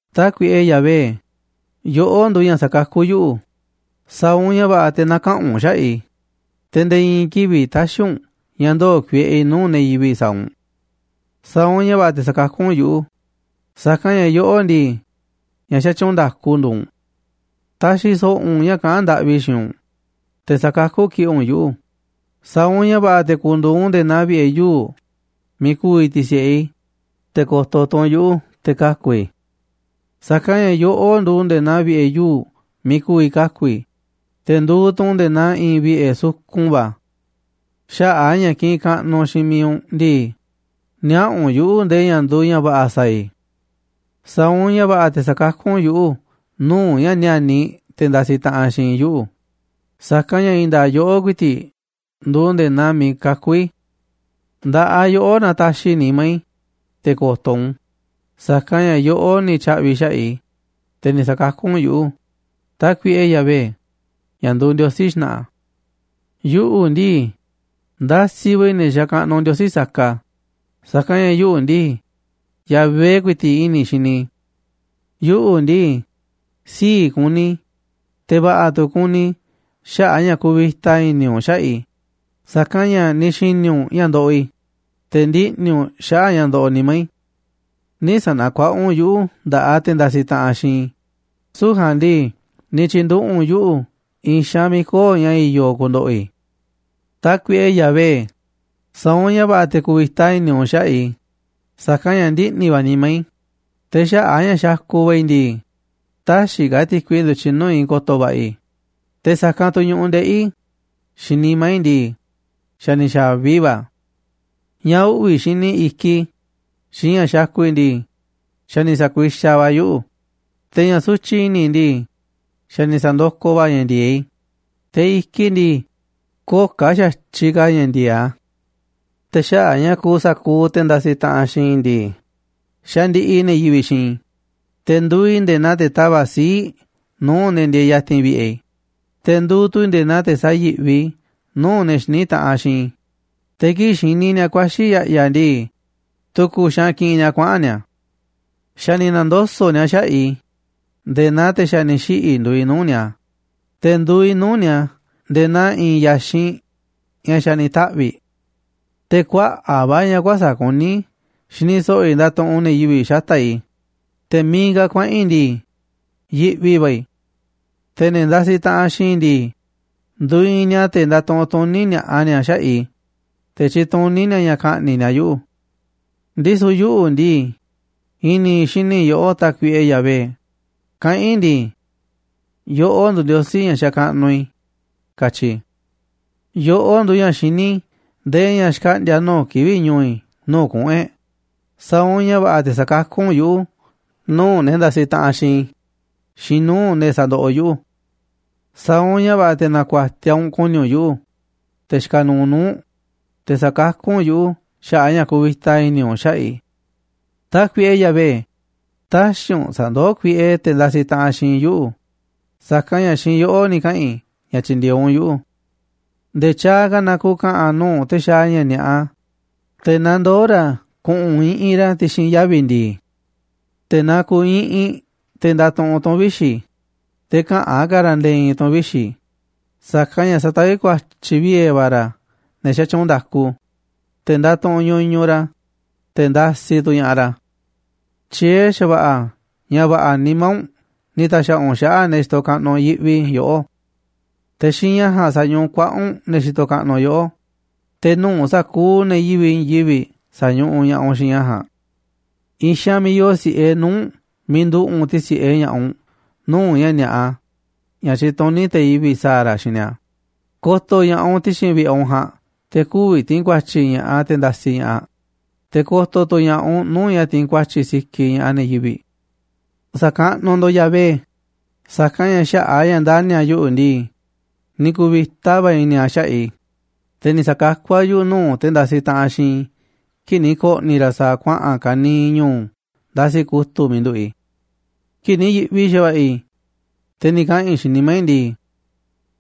Tákuiꞌe Yahvé, yoꞌó nduuꞌ ña̱ sakakú yuꞌu̱, sa̱a̱ u̱nꞌ ña̱ va̱ꞌa̱ te̱ na̱kaꞌa̱n u̱nꞌ xaꞌa̱ꞌ i̱, te̱ nde̱e̱ i̱i̱n kivi̱ꞌ tä̱xi̱ u̱nꞌ ña̱ ndoo̱ kuieꞌe i̱ nuu̱ꞌ ne̱ yivi̱ꞌ sa̱a̱ u̱nꞌ. Sa̱a̱ u̱nꞌ ña̱ va̱ꞌa̱ te̱ sa̱kakú u̱nꞌ yuꞌu̱, sa̱kanꞌ ña̱ yoꞌó ndii, ña̱ xatyuunꞌ nda̱ku nduuꞌ u̱nꞌ. Ta̱xi̱ so̱ꞌo̱ u̱nꞌ ña̱ kaꞌán ndaꞌvi i̱ xiinꞌ u̱nꞌ, te̱ sa̱kakú kiꞌi̱ꞌ u̱nꞌ yuꞌu̱, sa̱a̱ u̱nꞌ ña̱ va̱ꞌa̱ te̱ ku̱ndu̱u̱ u̱nꞌ nde̱e̱ naa vi̱ꞌe̱ yuu̱ꞌ miiꞌ ku̱vi̱ ti̱si̱ꞌe i̱, te̱ ko̱to̱ tu̱ u̱nꞌ yuꞌu̱ te̱ kaku̱ i̱. Sa̱kanꞌ ña̱ yoꞌó nduuꞌ nde̱e̱ naa vi̱ꞌe̱ yuu̱ꞌ miiꞌ ku̱vi̱ kaku̱ i̱, te̱ nduuꞌ tu̱ u̱nꞌ nde̱e̱ naa i̱i̱n vi̱ꞌe̱ sukun va̱. Xaꞌa̱ꞌ a̱ ña̱ kiꞌinꞌ kaꞌnuꞌ xiinꞌ mi̱iꞌ u̱nꞌ ndii, niaꞌa̱ u̱nꞌ yuꞌu̱ ndee ña̱ nduuꞌ ña̱ va̱ꞌa̱ sa̱a̱ i̱. Sa̱a̱ u̱nꞌ ña̱ va̱ꞌa̱ te̱ sakakú u̱nꞌ yuꞌu̱ nuu̱ꞌ ña̱ níániꞌ te̱ ndasiꞌ taꞌanꞌ xiinꞌ i̱ yuꞌu̱, sa̱kanꞌ ña̱ i̱i̱n nda̱a̱ꞌ yoꞌó ku̱i̱ti̱ꞌ nduuꞌ nde̱e̱ naa miiꞌ kakú i̱. Nda̱ꞌaꞌ yoꞌó nataxiꞌ i̱ nimá i̱, te̱ ko̱to̱ u̱nꞌ u̱n, sa̱kanꞌ ña̱ yoꞌó ni̱ tya̱ꞌvi̱ xaꞌa̱ꞌ i̱, te̱ ni̱ sa̱kakú u̱nꞌ yuꞌu̱, Tákuiꞌe Yahvé, ña̱ nduuꞌ Ndiosí xna̱ꞌa̱. Yuꞌu̱ ndii, ndasiꞌ va̱ i̱ ne̱ xakaꞌnuꞌ ndiosí saka, sa̱kanꞌ ña̱ yuꞌu̱ ndii, Yahvé ku̱i̱ti̱ꞌ i̱ni̱ i̱ xini i̱. Yuꞌu̱ ndii, sii̱ꞌ ku̱ni̱ i̱, te̱ va̱ꞌa̱ tu̱ ku̱ni̱ i̱ xaꞌa̱ꞌ a̱ ña̱ kuvita i̱ni̱ u̱nꞌ xaꞌa̱ꞌ i̱, sa̱kanꞌ ña̱ ni̱ xi̱ni̱ u̱nꞌ ña̱ ndoꞌoꞌ i̱, te̱ ndiꞌni̱ u̱nꞌ xaꞌa̱ꞌ ña̱ ndoꞌoꞌ nimá i̱. Nï̱ sa̱na̱kuaꞌa u̱nꞌ yuꞌu̱ nda̱ꞌaꞌ te̱ ndasiꞌ taꞌanꞌ xiinꞌ i̱, süu̱ꞌ ja̱a̱nꞌ ndii ni̱ tyi̱nduꞌu̱ꞌ u̱nꞌ yuꞌu̱ i̱i̱n xaanꞌ miiꞌ köo̱ꞌ ña̱ i̱yo̱ ku̱ndo̱ꞌo̱ i̱. Tákuiꞌe Yahvé, sa̱a̱ u̱nꞌ ña̱ va̱ꞌa̱ te̱ ku̱vi̱ta i̱ni̱ u̱nꞌ xaꞌa̱ꞌ i̱, sa̱kanꞌ ña̱ ndiꞌni̱ va̱ nimá i̱, te̱ xaꞌa̱ꞌ a̱ ña̱ xakuꞌ va̱ i̱ ndii, täxiꞌ ka̱ ti̱kui ndu̱tyiꞌ nuu̱ꞌ i̱ ko̱to̱ va̱ꞌa̱ i̱, te̱ sa̱kanꞌ tu̱ ñu̱ꞌuꞌ ndeꞌi̱ i̱ xiinꞌ nimá i̱ ndii, xa̱ ni̱ xa̱vi va̱ a̱. Ña̱ uꞌvi̱ xini i̱kiꞌ i̱ xiinꞌ ña̱ xakuꞌ i̱ ndii, xa̱ ni̱ sa̱kuixaꞌ va̱ a̱ yuꞌu̱, te̱ ña̱ sutyiꞌ i̱ni̱ i̱ ndii, xa̱ ni̱ sa̱ndokoꞌ va̱ a̱ ña̱ ndi̱e̱eꞌ i̱, te̱ i̱kiꞌ i̱ ndii, köo̱ꞌ ka̱ xa̱tyiꞌ ka̱ ña̱ ndi̱e̱eꞌ a̱. Te̱ xaꞌa̱ꞌ ña̱ kuuꞌ sa̱kuuꞌ te̱ ndasiꞌ taꞌanꞌ xiinꞌ i̱ ndii, xandiꞌiꞌ ne̱ yivi̱ꞌ xiinꞌ i̱, te̱ nduuꞌ i̱ nde̱e̱ naa te̱ tava̱ꞌ sii̱ꞌ nuu̱ꞌ ne̱ ndieeꞌ ya̱ti̱n vi̱ꞌe̱ i̱, te̱ nduuꞌ tu̱ i̱ nde̱e̱ naa te̱ sayi̱ꞌvi nuu̱ꞌ ne̱ xiní taꞌanꞌ xiinꞌ i̱, te̱ kii̱ꞌ xini ni̱a̱ ku̱a̱xi̱ i̱ ya̱ꞌya̱ ndii, tu̱ku̱ xaanꞌ kiꞌinꞌ ni̱a̱ kuaꞌa̱n ni̱a̱. Xa̱ ni̱ na̱ndoso̱ꞌ ni̱a̱ xaꞌa̱ꞌ i̱, nde̱e̱ naa te̱ xa̱ ni̱ xiꞌi̱ nduuꞌ i̱ nuu̱ꞌ ni̱a̱, te̱ nduuꞌ i̱ nuu̱ꞌ ni̱a̱ nde̱e̱ naa i̱i̱n ya̱xinꞌ ña̱ xa̱ ni̱ taꞌvi̱ꞌ. Te̱ kuaꞌa̱ꞌ va̱ ña̱ kuäsa̱ꞌ kuní xini so̱ꞌo̱ i̱ ndatuꞌunꞌ ne̱ yivi̱ꞌ xata̱ꞌ i̱, te̱ miiꞌ ka̱ kuaꞌa̱n i̱ ndii, yiꞌvi va̱ i̱, te̱ ne̱ ndasiꞌ taꞌanꞌ xiinꞌ i̱ ndii, nduiinꞌ ni̱a̱ te̱ ndatuꞌunꞌ tuní ni̱a̱ꞌa ni̱a̱ xaꞌa̱ꞌ i̱, te̱ tyituní ni̱a̱ ña̱ ka̱ꞌni̱ꞌ ni̱a̱ yuꞌu̱. Ndisu̱ yuꞌu̱ ndii, i̱ni̱ i̱ xini yoꞌó, Tákuiꞌe Yahvé, kaꞌán i̱ ndii: “Yoꞌó nduuꞌ Ndiosí ña̱ xakaꞌnuꞌ i̱”, katyi i̱. Yoꞌó nduuꞌ ña̱ xiní ndee ña̱ xkaꞌndi̱a̱ nuu̱ꞌ kivi̱ꞌ ñu̱u̱ i̱ nuu̱ꞌ kuꞌu̱n e̱ꞌ, sa̱a̱ u̱nꞌ ña̱ va̱ꞌa̱ te̱ sa̱kakú u̱nꞌ yuꞌu̱ nuu̱ꞌ ne̱ ndasiꞌ taꞌanꞌ xiinꞌ i̱ xiinꞌ nuu̱ꞌ ne̱ sandoꞌoꞌ yuꞌu̱. Sa̱a̱ u̱nꞌ ña̱ va̱ꞌa̱ te̱ na̱ku̱a̱tiaꞌ u̱nꞌ ku̱ni̱ u̱nꞌ yuꞌu̱, te̱ xikaꞌ nuuꞌ nuu̱ꞌ u̱nꞌ, te̱ sa̱kakú u̱nꞌ yuꞌu̱ xaꞌa̱ꞌ a̱ ña̱ kuvita i̱ni̱ u̱nꞌ xaꞌa̱ꞌ i̱. Tákuiꞌe Yahvé, tä̱xi̱ u̱nꞌ sa̱ndoó kuiꞌe te̱ ndasiꞌ taꞌanꞌ xiinꞌ i̱ yuꞌu̱, sa̱kanꞌ ña̱ xiinꞌ yoꞌó ni̱ kaꞌa̱n i̱ ña̱ tyi̱ndi̱e̱eꞌ u̱nꞌ yuꞌu̱. Nde̱e̱ tyaaꞌ ka̱ na ku̱ka̱ꞌa̱n nuu̱ꞌ te̱ xaaꞌ ña̱ ni̱a̱ꞌa, te̱ na ndoo̱ ra̱ ku̱ꞌu̱n iꞌinꞌ ra̱ ti̱xi̱n yavi̱ ndi̱i̱. Te̱ na ku̱u̱ iꞌinꞌ te̱ ndatuꞌunꞌ tu̱n vixi̱, te̱ käꞌa̱n ka̱ ra̱ nde̱e̱ i̱i̱n tu̱n vixi̱, sa̱kanꞌ ña̱ sataví ku̱a̱tyi̱ vie̱ va̱ ra̱ ne̱ xatyuunꞌ nda̱ku, te̱ ndatuꞌunꞌ ñuñuꞌ ra̱, te̱ ndasiꞌ tu̱ ña̱ꞌaꞌ ra̱. Tyiee̱ xa̱va̱ꞌa̱ ña̱ va̱ꞌa̱ nimá u̱nꞌ ni̱ ta̱xa̱ꞌa̱ u̱nꞌ xaꞌa̱ꞌ ne̱ xitoꞌ kaꞌnuꞌ yiꞌvi yoꞌó. Te̱ xiinꞌ ña̱ ja̱a̱nꞌ sañuꞌuꞌ kuaꞌa̱ꞌ u̱nꞌ ne̱ xitoꞌ kaꞌnuꞌ yoꞌó, te̱ nuu̱ꞌ sa̱kuuꞌ ne̱ yivi̱ꞌ i̱i̱n yivi̱ꞌ sañuꞌuꞌ ña̱ꞌaꞌ u̱nꞌ xiinꞌ ña̱ ja̱a̱nꞌ. I̱i̱n xaanꞌ miiꞌ yoo si̱ꞌe nuu̱ꞌ u̱nꞌ, miiꞌ nduꞌu̱ꞌ u̱nꞌ ti̱si̱ꞌe ña̱ꞌaꞌ u̱nꞌ nuu̱ꞌ ña̱ ni̱a̱ꞌa ña̱ tyituní te̱ yivi̱ꞌ sa̱a̱ ra̱ xiinꞌ ni̱a̱, ko̱to̱ ña̱ꞌaꞌ u̱nꞌ ti̱xi̱n vi̱ꞌe̱ u̱nꞌ ja̱a̱nꞌ te̱ kü̱vi̱ ti̱i̱n ku̱a̱tyi̱ ña̱ꞌaꞌ te̱ ndasiꞌ ña̱ꞌaꞌ, te̱ ko̱to̱ tu̱ ña̱ꞌaꞌ u̱nꞌ nuu̱ꞌ ña̱ tiinꞌ ku̱a̱tyi̱ sikiꞌ ña̱ꞌaꞌ ne̱ yivi̱ꞌ. Sa̱kaꞌnuꞌ ndo̱ꞌ Yahvé, sa̱kanꞌ ña̱ xaꞌa̱ꞌ a̱ ña̱ ndani̱ a̱ yuꞌu̱ ndii, ni̱ ku̱vi̱ta va̱ i̱ni̱ a̱ xaꞌa̱ꞌ i̱, te̱ ni̱ sa̱kakú a̱ yuꞌu̱ nuu̱ꞌ te̱ ndasiꞌ taꞌanꞌ xiinꞌ i̱ kii̱ꞌ ni̱ ko̱ꞌni̱ ra̱ sa̱a̱ kuaꞌa̱n ka̱niiꞌ ñu̱u̱ ndasiꞌ kutu̱ꞌ miiꞌ nduꞌu̱ꞌ i̱. Kii̱ꞌ ni̱ yi̱ꞌvi xa̱va̱ꞌa̱ i̱, te̱ ni̱ kaꞌa̱n i̱ xiinꞌ nimá i̱ ndii: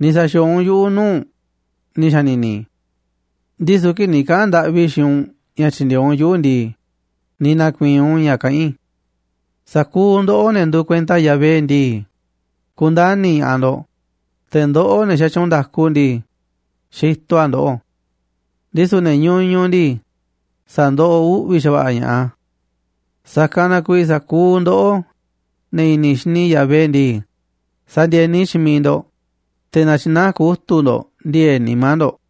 “Ni̱ sa̱xi̱o̱o̱ u̱nꞌ yuꞌu̱ nuu̱ꞌ u̱nꞌ”, ni̱ xa̱ni̱ni̱ i̱. Ndisu̱ kii̱ꞌ ni̱ kaꞌa̱n ndaꞌvi i̱ xiinꞌ u̱nꞌ ña̱ tyi̱ndi̱e̱eꞌ u̱nꞌ yuꞌu̱ ndii, ni̱ na̱ku̱i̱i̱n u̱nꞌ ña̱ kaꞌán i̱. Sa̱kuuꞌ ndoꞌó, ne̱ nduuꞌ kuenta Yahvé ndii, ku̱ndani̱ ña̱ꞌaꞌ ndo̱ꞌ, te̱ ndoꞌó, ne̱ xatyuunꞌ nda̱ku ndii, xitoꞌ a̱ ndoꞌó. Ndisu̱ ne̱ ñuñuꞌ ndii, sa̱ndoꞌoꞌ uꞌvi̱ xa̱va̱ꞌa̱ ña̱ꞌaꞌ a̱. Sa̱kanꞌ na kuiiꞌ sa̱kuuꞌ ndoꞌó, ne̱ i̱ni̱ xini Yahvé ndii, sa̱ndi̱e̱ni xiinꞌ miiꞌ ndo̱ꞌ, te̱ na̱tyi̱naá kutu̱ꞌ ndo̱ꞌ ndi̱e̱e̱ꞌ nimá ndo̱ꞌ.